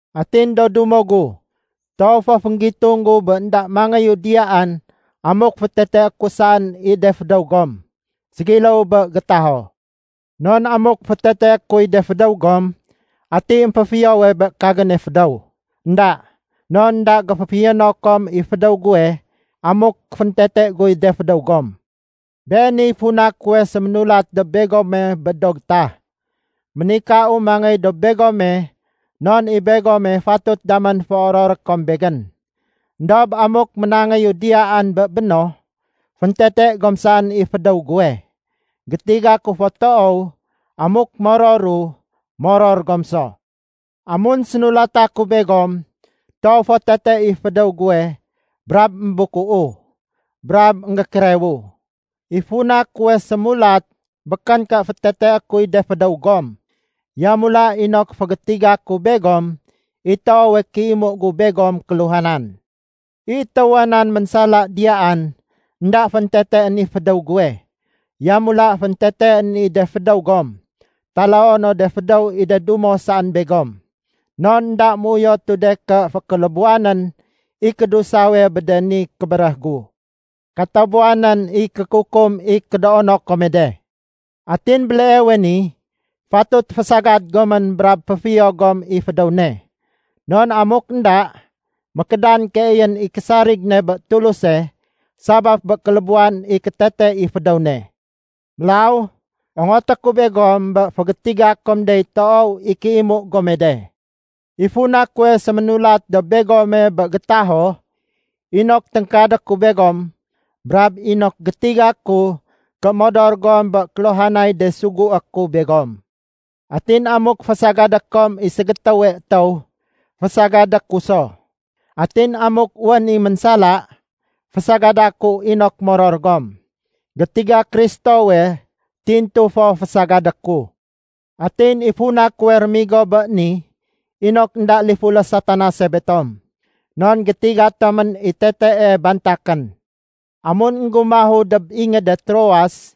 Atin do dumo gu, toow fo fénggitung gu bé énda mangéyu diyaan amuk féteteé ku saén i de fédéw gom ségiléw bé gétaho. Non amuk féteteé kuy de fédéw gom, ati émféfiyowe bé kagéne fédéw? Enda, non énda géféfiyono kom i fédéw guwe amuk féntete guy de fédéw gom. Beeniy funa kuwe séménulat dob begome bé do gétah. Ménikau mangéy dob begome, non i begome fatut damén féororé kom begén. Endob amuk ménangéyu diyaan bé béno, féntete gom saén i fédéw guwe. Gétiga ku fo toow, amuk mororu, moror gom so. Amun sénulata ku begom, toow fo tete i fédéw guwe brab émbukuu brab énggékérewu. I funa kuwe sémulat békén ké féteteé kuy de fédéw gom. Yamula inok fégétiga ku begom i toowe kéimu gu begom kéluhanan. I étéwa nan ménsala diyaan, énda fénteteén i fédéw guwe, yamula fénteteén i de fédéw gom, taloo no de fédéw i de dumo saén begom. Non énda méuyotu de ké fékélébuwanén i kédusawe de bé ni kébéréh gu. Katabuwanén i kékukum i kédoono kome de. Atin béleewe ni, fatut fésagad gomén brab féfiyo gom i fédéw ne, non amuk énda, mékédan keeyén i késarig ne bé Tuluse sabaf bé kélébuwan i kétete i fédéw ne. Mélaw, ongoté ku begom bé fégétiga kom dey toow i kéimu gome de. I funa kuwe séménulat dob begome bé gétaho inok téngkadé ku begom brab inok gétiga ku ké modor gom bé kéluhanay de sugué ku begom. Atin amuk fésagadé kom i ségétéwe étéw, fésagadé ku so. Atin amuk wén i ménsala, fésagada ku inok moror gom. Gétiga Kristowe tintu fo fésagadé ku. Atin i funa kuwe rémigo bé ni, inok énda lifulé Satanase betom. Non gétiga tomén i tetee bantakén. Amun énggumahu dob ingéde Troas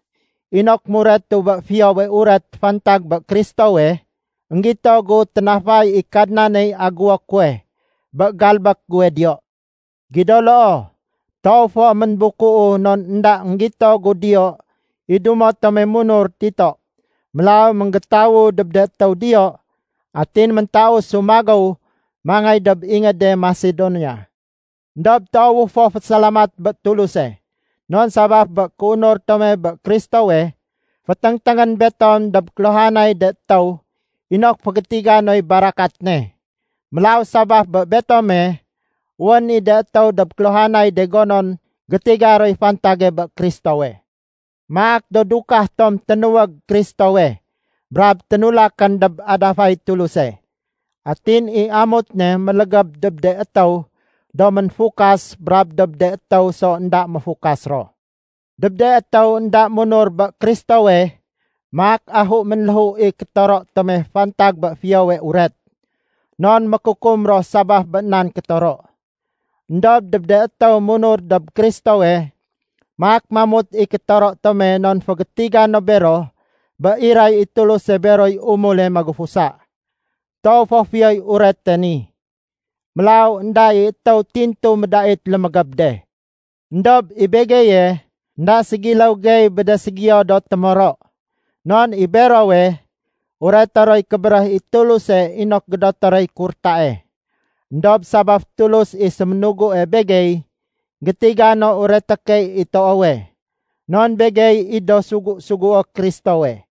inok muretu bé Fiyowe Uret fantag bé Kristowe, énggito gu ténafay i Kadnaney agéwo kuwe bé galbék guwe diyo. Gido loo, toow fo ménbukuu non énda énggito gu diyo i dumo tome munur Tito. Mélaw ménggétawu dob de étéw diyo, atin méntausu magéw mangéy dob ingéde Masedonia. Endob toowu fo fésalamat bé Tuluse. Non sabaf bé kéunur tome bé Kristowe, féténgténgén betom dob kéluhanay de étéw inok fégétiga noy barakat ne. Mélaw sabaf bé betome, wén i de étéw dob kéluhanay de gonon gétiga roy fantage bé Kristowe. Maak do dukah tom ténuwég Kristowe brab ténulakén dob adafay Tuluse. Atin i amut ne mélégéb dob de étéw do ménfukas brab dob de étéw so énda méfukas ro. Dob de étéw énda munur bé Kristowe, maak ahu ménléhu i kétoro tome fantag bé Fiyowe Uret, non mékukum ro sabaf bé nan kétoro. Endob dob de étéw munur dob Kristowe, maak mamut i kétoro tome non fégétiga no bero bé iray i Tuluse beroy umule magufusa. Toow fo Fiyoy Urete ni. Mélaw énda i étéw tintu médait lémégéb de. Endob i begeye, énda ségiléw gey bé de ségiyo do témoro. Non i berowe, ureté roy kébéréh i Tuluse inok gédoté roy kurtae. Endob sabaf Tulus i séménugue begey, gétiga no ureté key i toowe, non begey i do sugu-sugué Kristowe.